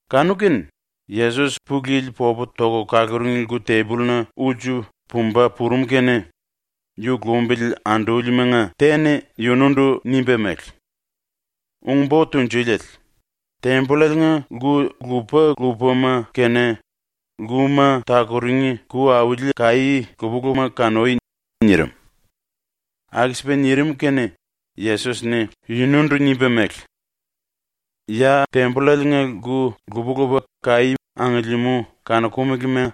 Kanu-kene Yesos ⸤Pulu Yili popu toku kaluring⸥ lku-tembolluna ulsu pumba purum kene yu lumbili andúlimanga te-ni yunundu nimba mele: “Ung-Bo Tunjuliele, tembollaliinga lku lupa-lupama kene, lkuma takuring ku auli kaí lupa-lupama kanui.” nirim. ⸤Aku-sipa nirim kene⸥ Yesos-ni yunundu nimba mele: “Ya ⸤tembollaliinga⸥ lku lupa-lupa kaí angiliimú kanokumelema,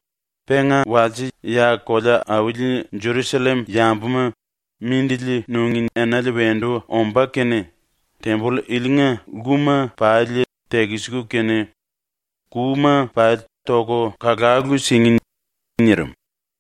penga ⸤walse ya kolea-auli Jerusallem yambuma mindili nungí enale wendu ombá kene⸥ temboll ilinga lkuma pali tekisiku kene kuma pali toku kalalu singí.” nirim.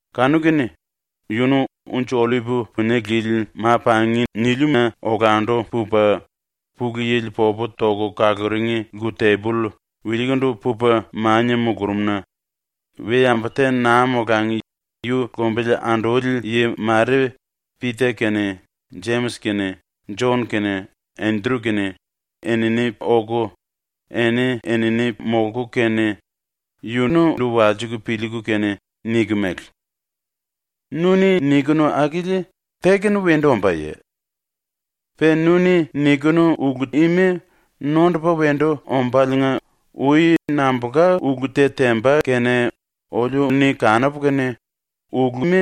Kanu-kene yunu Unji-Ollip Punie Lili Ma-Pangina olandu pupa ⸤Pulu Yili popu toku kaluring⸥ lku-temboll wilikundu pupa mania mulurumna we-yambu te naa molangi ⸤yu lumbili anduli yi mare⸥ Pita kene, Jemis kene, Jon kene, Endru kene enini oku, eni-enini molku kene yunundu walsiku piliiku kene niku mele: “Nu-ni nikinu akili te-kene wendu ombáye? Pe nu-ni nikinu ulu ima nondupa wendu ombáliinga ui nambulka ulu te temba kene oliu-ni kanupu kene ‘Uluma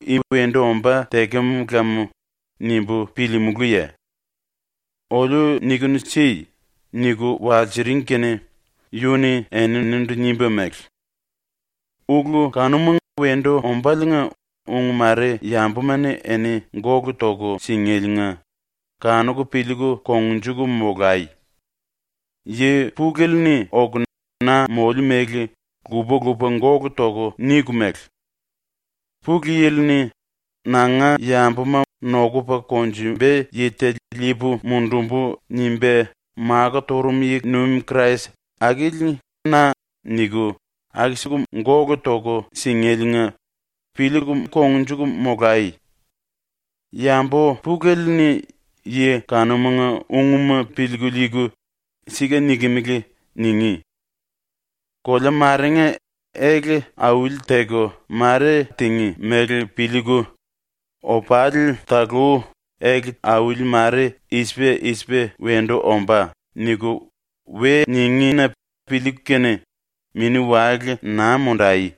i wendu ombá tekem lam.’ nimbu piliimulúye? Oliu niku si.” niku walsiring kene yu-ni eninindu nimba mele: “⸤Ulu kanuma wendu ombáliinga ung mare⸥ yambuma-ni eni gólu toku singéliinga kanuku piliiku kongnjuku molai. Yi pulele-ni oku na moliu mele lupa-lupa gólu toku niku mele: “⸤Pulu Yili-ni ‘Nanga yambuma nokupa konjumba yi te liipu mundumbu.’ nimba makó turum yi-nuim Krais⸥ akili na.” niku aku-siku gólu toku singéliinga piliiku kongnjuku molai. Yambu pulele-ni yi kanumanga ungma piliiku liiku “Sika nikimili.” ningí. “Kolea marenga ele auli-teku mare tingí mele piliiku, ‘Opali talú ele auli mare i-sipa i-sipa wendu ombá.’ niku we ningí-na piliiku kene mini-wale naa mundai.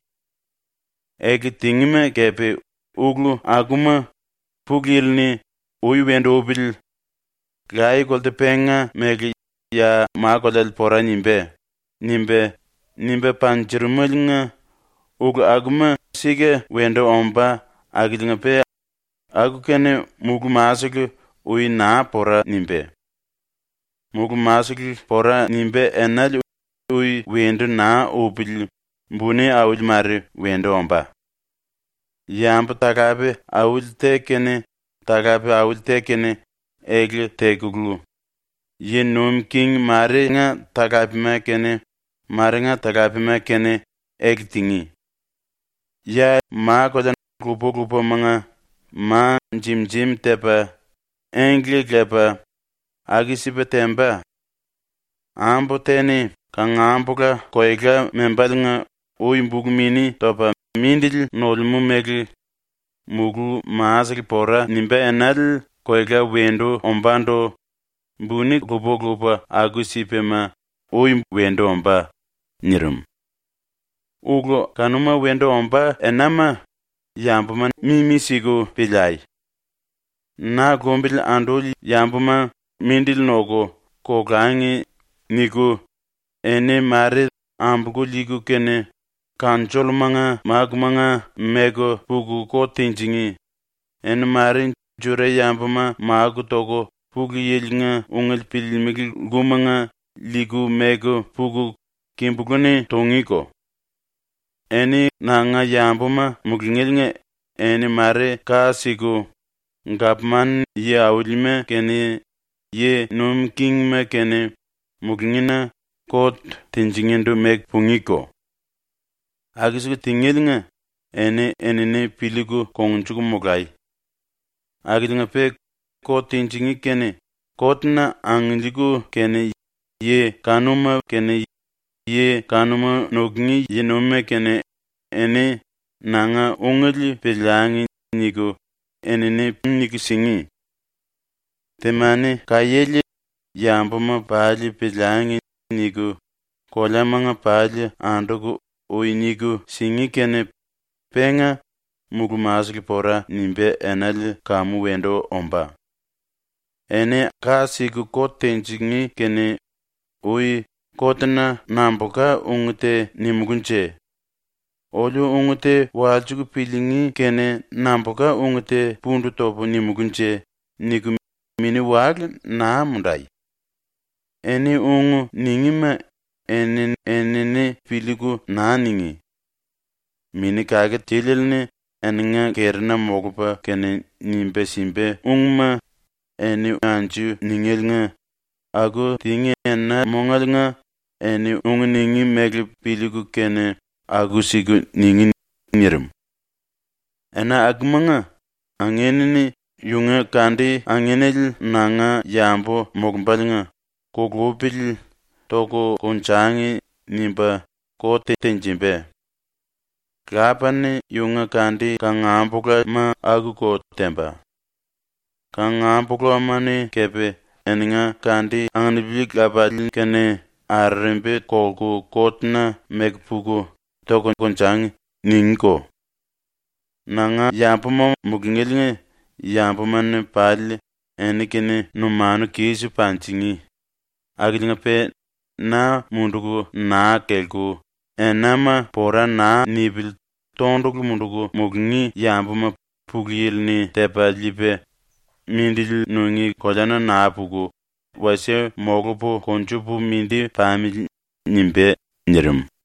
Ele tingíma kepe ulu akuma Pulu Yili-ni ‘Ui wendu upili. Laye-kolte penga mele ya ma-koleale pora nimbá.’ nimba, nimba panjurumeliinga ulu akuma sika wendu ombá akiliinga-pe aku-kene mulú-masele ui naa pora nimbá. ⸤Mulú-masele pora nimbá enale ui wendu naa upili buni auli mare wendu ombá.⸥ Yambu-talape auli te kene talape auli te kene ele tekulu, yi nuim king marenga talapema kene marenga talapema kene ele tingí. Ya ma-kolea lupa-lupamanga ma jim-jim tepa, engle lepa, aku-sipa temba. Ambu te-ni kangambula koela membáliinga ui bulu-mini topa mindili nolemú mele, mulú-masele pora nimbá enale koela wendu ombándu buni lupa-lupa aku-sipama ui wendu ombá.” ⸤nirim.⸥ “⸤Ulu kanuma wendu ombá enama⸥ yambuma mimi-siku piliai. ⸤‘Na lumbili anduli yambuma mindili noku, kolangi.’ niku,⸥ eni ⸤mare ambolku liiku kene⸥ kanjollumanga mákumanga meku puku kot tinjingí, eni ⸤mare⸥ Juda-yambuma máku toku Pulu Yili-nga ungele piliilimili lkumanga liiku meku puku kimbulú-ni tungíko. Eni nanga yambuma mulungéliinga eni ⸤mare ka siku⸥ gapman-yi aulima kene yi nuim kingima kene mulungína ⸤kot tinjingíndu⸥ meku pungíko. Aku-siku tingéliinga eni-enini piliiku kongnjuku molai. ⸤Akiliinga-pe kot tinjingí kene kot-na angiliiku kene yi kanuma kene yi kanuma nukungí yi-nuimima kene⸥ eni ‘Nanga ungele piliangi.’ niku enini niku singí. Temani-kaiéle ‘Yambuma pali piliangi.’ niku koleamanga pali anduku ui niku singí ⸤kene, penga mulú-masele pora nimbá enale kamu wendu ombá⸥. Eni ka siku kot tinjingí kene ui ‘Kotna nambulka ung te nimulúnje? Oliu ung te walsiku piliingí kene nambulka ung te pundu topu nimulúnje?’ niku mini-wale naa mundai. Eni ung ningíma eni-enini piliiku naa ningí. Mini Kake Tiliele-ni eninga kerina molupa kene nimba simba ungma eni anju ningéliinga aku tingí ena-mongaliinga eni ung ningí mele piliiku kene aku-siku ningí.” ⸤nirim.⸥ “⸤Ena akumanga⸥ angin-ni yunga kandi-anginele ⸤nanga yambu molumbáliinga⸥ ‘Kulupili toku konjangi.’ nimba kot tenjimba. Lapa-ni yunga kandi-kangambulama akuko temba. Kangambulama-ni kepe eninga kandi anupili lapalii-kene arerembi kolku kot-na meku puku “Toku konjangi.” ningíko. Nanga yambuma mulungéliinga yambuma-ni pali eni-kene numanu kis panjingí, akiliinga-pe na munduku naa kelku enama pora naa nipili tondulu munduku mulungí yambuma Pulu Yili-ni tepa liipa ‘Mindili nungí koleana naa puku wasie molupu konjupu mindi pamili.’ nimbá.” ⸤nirim.⸥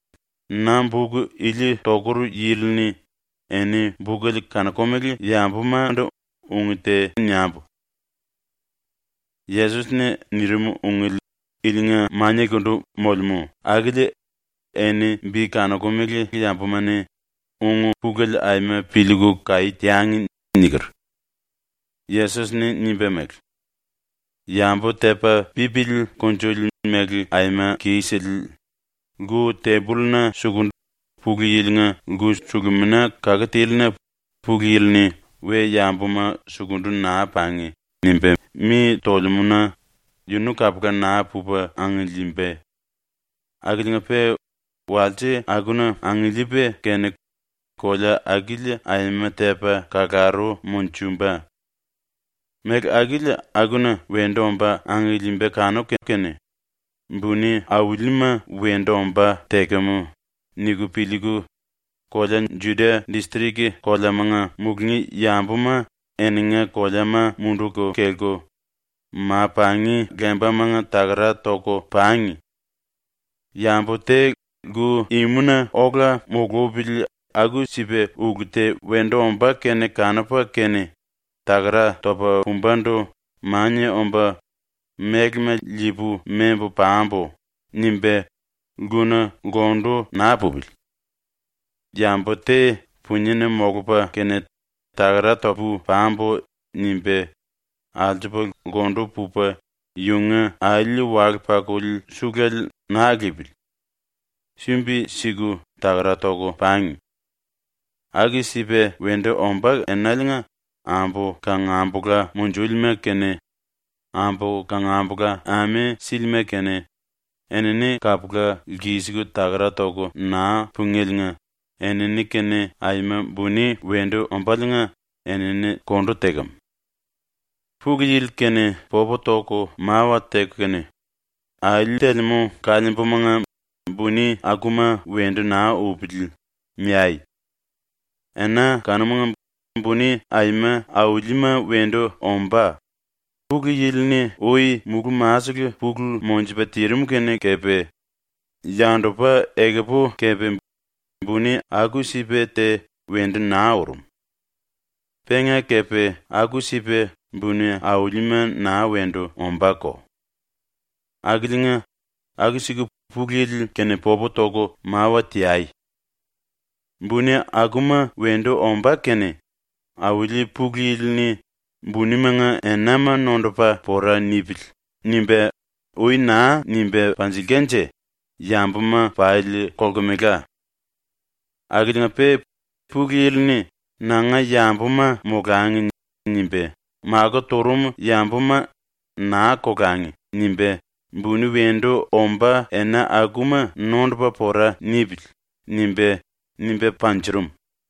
(⸤Na buk ili tokur yili-ni⸥ eni bukele kanokumele yambumandu ung te niambu: ‘⸤Yesos-ni nirim⸥ ungele ilinga maniakundu molemú akili eni bi kanokumele yambuma-ni ung-pulele aima piliiku kaí teangi.’ ⸤niker. Yesos-ni nimba mele:⸥) “⸤Yambu⸥ tepa pipili kunjuli mele aima kisele ⸤lku-tembolluna suku Pulu Yili-nga lku-sulumina kake tílina Pulu Yili-ni⸥ “We-yambuma sukundu naa pangi!” nimba mi tolemú-na yunu kapula naa pupa angiliimba, akiliinga-pe walse akuna angiliipa kene kolea akili aima tepa kalaru monjumba. Méle akili akuna ⸤wendu omba⸥ angiliimba kanuku kene ⸤‘Buni aulima wendu ombá tekem.’ niku piliiku⸥ kolea Judia distrik koleamanga mulungí yambuma ⸤eninga koleama munduku kelku⸥ ma-pangi lembamanga takara toku pangi. Yambu te lku-imuna ola mulupili ⸤aku-sipa ulu te wendu ombá kene kanupa kene takara topa pumbandu⸥ mania omba ‘Mélema liipu membu pambu.’ nimba lkuna lkundu naa pupili. Yambu te puniena molupa kene ⸤‘Takara topu pambu.’ nimba⸥ alsupa lkundu pupa yunga alí-wale-pakuli suluele naa liipili. ⸤Sumbi siku takara toku pangi.⸥ Aku-sipa wendu ombá enaliinga ambu kangambula munjúlima kene, ambu kangambula ame sílima kene, ⸤enini kapula lkisiku takara toku naa pungéliinga⸥ enini-kene aima buni wendu ombáliinga enini kondu tekem. “Pulu Yili-kene popu toku mawa teku kene, ‘Alí telemú kaliimbumanga buni akuma wendu naa upili.’ niai. Ena kanumanga buni aima aulima wendu ombá, Pulu Yili-ni ui mulú-masele pulu monjupa tirim kene kepe, yandupa ekupu kepe buni aku-sipa te wendu naa urum. Penga kepe aku-sipa buni aulima naa wendu ombáko. Akiliinga aku-siku Pulu Yili-kene popu toku mawa teai. ⸤Buni akuma wendu ombá kene⸥ Auli ⸤Pulu Yili⸥ -ni ‘Bunimanga enama nondupa pora nipili.’ nimba ui naa nimba panjilkanje yambuma pali kolkemela. Akiliinga-pe Pulu Yili-ni ‘Nanga yambuma molangi.’ nimba makó turum yambuma ‘naa kolangi.’ nimba ‘Buni wendu ombá ena akuma nondupa pora nipili.’ nimba, nimba panjurum.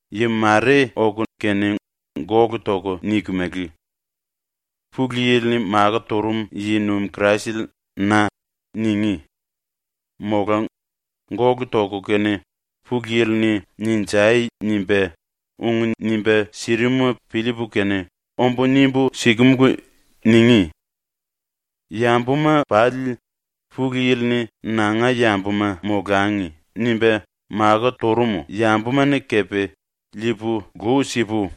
Yi mare oku kene gólu toku niku mele: “Pulu Yili-ni makó turum yi-nuim Kraisele na.” ningí, mola gólu toku kene “Pulu Yili-ni “Ninjai.” nimba, ung nimba sirimuma piliipu kene ombu nimbu sikemulu.” ningí. ‘Yambuma pali, Pulu Yili-ni ‘Nanga yambuma molangi.’ nimba makó turum yambuma-ni kepe liipu lu sipu,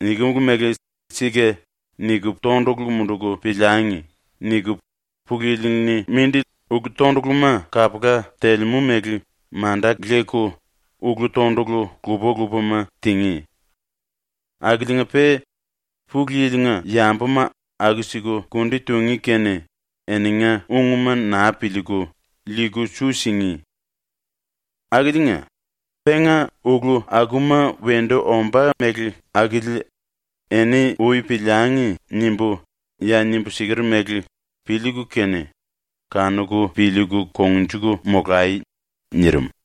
nikimulu mele ‘Sika’ niku tondulu munduku piliangi.’ niku Pulu Yili-ni mindi ulu-tonduluma kapula telemú mele manda leku ulu-tondulu lupa-lupama tingí. Akiliinga-pe Pulu Yili-nga yambuma aku-siku kundi tungí kene eninga ungma naa piliiku, liiku su singí. Akiliinga, penga ulu akuma wendu ombá mele akili ‘Eni ui piliangi.’ nimbu ya nimbu siker mele piliiku kene kanuku piliiku kongnjuku molai!” ⸤nirim.⸥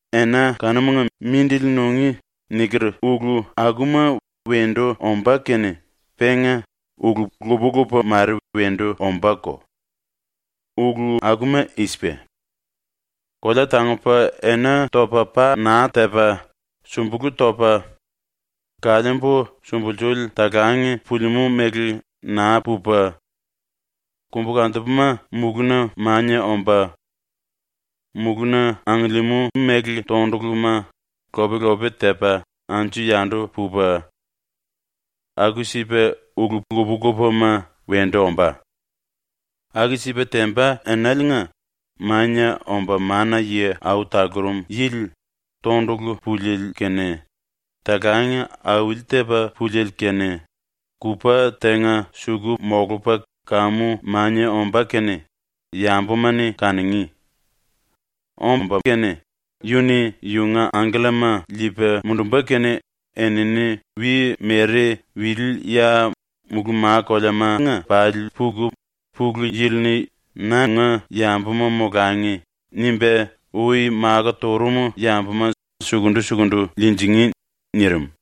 “Ena kanumanga mindili nungí niker ulu akuma wendu ombá kene penga ⸤ulu lupa-lupa mare wendu ombáko. Ulu akuma i-sipa:⸥ ‘Kolea tangupa ena topa pa naa tepa, sumbulú topa, kaliimbu sumbulsuli talang pulimú mele naa pupa, kombukantupuma mulúna mania omba, mulúna angiliimú méle tonduluma lop-lope tepa anju-yandu pupa, aku-sipa ulu lupa-lupama wendu ombá.’ Aku-sipa temba enaliinga Mania Omba Mana-Yi Au Talurum Yili tondulu puliele kene, talang auli-tepa púliele kene kupa tenga suku molupa kamu mania ombá ⸤kene⸥ yambuma-ni kanungí. Omba kene yu-ni yunga angkellama liipa mundumba kene enini wi-mere wili-ya mulú ma koleamanga pali puku Pulu Yili-ni ‘Nanga yambuma molangi.’ nimba ui makó turum yambuma sukundu-sukundu liinjingí.” ⸤nirim.⸥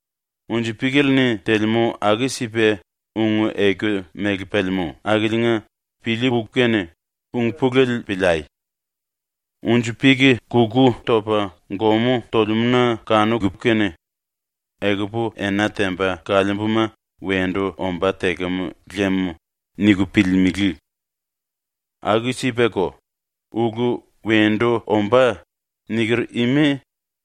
“Unji-píkele-ni telemú aku-sipa ung-eku mele pelemú akiliinga piliiku kene ung-pulele piliai. Unji-pik kuku topa gomú tolemú-na kanuku kene ‘Ekupu ena temba kaliimbuma wendu ombá tekem lem.’ niku piliilimili. Aku-sipako, ulu “Wendu ombá.” niker ima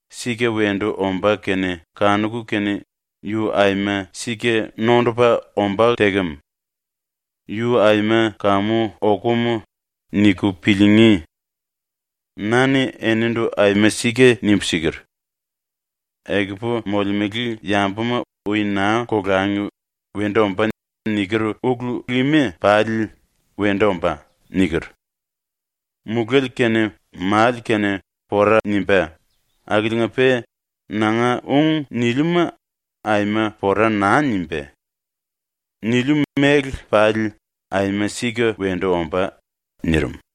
sika wendu ombá kene kanuku kene ‘Yu aima sika nondupa ombá tekem. Yu aima kamu okum.’ niku piliingí. “Na-ni enindu aima sika nimbu siker: “Ekupu molemele yambuma ui naa kolangi “Wendu ombá.” niker ulu ima pali wendu ombá.” niker. Muléle kene male kene pora nimbá akiliinga-pe nanga ung niliuma aima pora naa nimbá. ⸤Niliu mele pali aima sika wendu ombá.⸥” ⸤nirim.⸥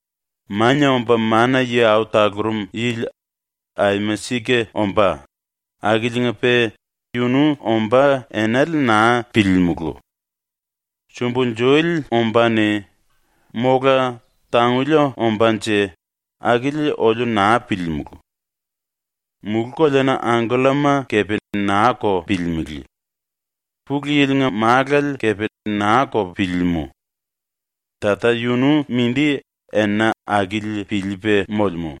“⸤Mania Omba Mana-Yi Au Talurum Yili aima sika ombá⸥ akiliinga-pe yunu ombá enale naa piliilimulu. Sumbulsuli ombáne mola tanguli ombánje akili oliu naa piliilimulu. Mulú-koleana angkellama kepe naa-ko piliilimili. Pulu Yili-nga Málale kepe naa-ko piliilimú. Tata yunu mindi ⸤ena akili⸥ piliipa molemú.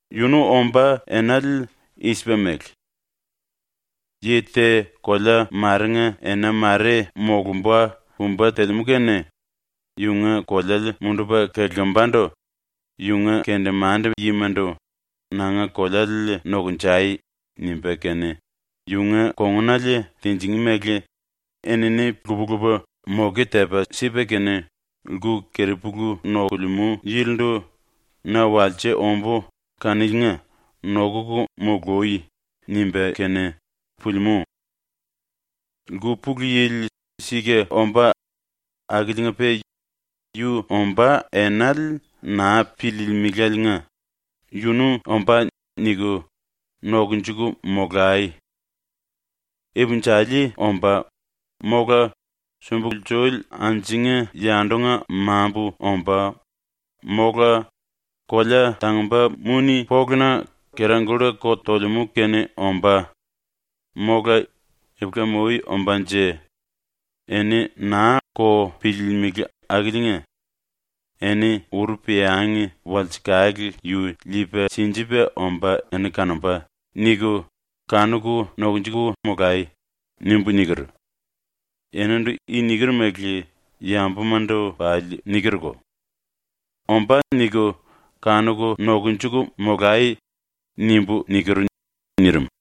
Yunu ombá enale i-sipa mele: Yi te kolea marenga ena mare molumba pumba telemú kene yunga koleale mundupa kelimbandu yunga kendemande-yimandu “Nanga koleale nokunjai.” nimba kene yunga kongunale tinjingí mele enini lupa-lupa moke tepa sipa kene lku-keripulu nokulemú yilindu “Na walse ombú kaniliinga nokuku mului.” nimba kene pulimú. “Lku pulu yili sika ombá akiliinga-pe yu ombá enale naa piliilimiláliinga ‘Yunu ombá.’ niku nokunjuku molai. Ipinjali ombá, mola sumbulsuli anjunga-yandunga mambu ombá, mola kolea tangumba muni-poluna kera-kulla ko tolemú kene ombá, mola ipulam-ui ombánje, eni naa-ko piliilimili akiliinga “‘Eni uru peangi walsekale yu liipa sinjipa omba eni kanomba.’ niku, kanuku nokunjuku molai.” nimbu niker. “Enindu i niker mele yambumandu pali nikerko, “⸤‘Ombá.’ niku⸥ kanuku nokunjuku molai.” nimbu niker.” nirim.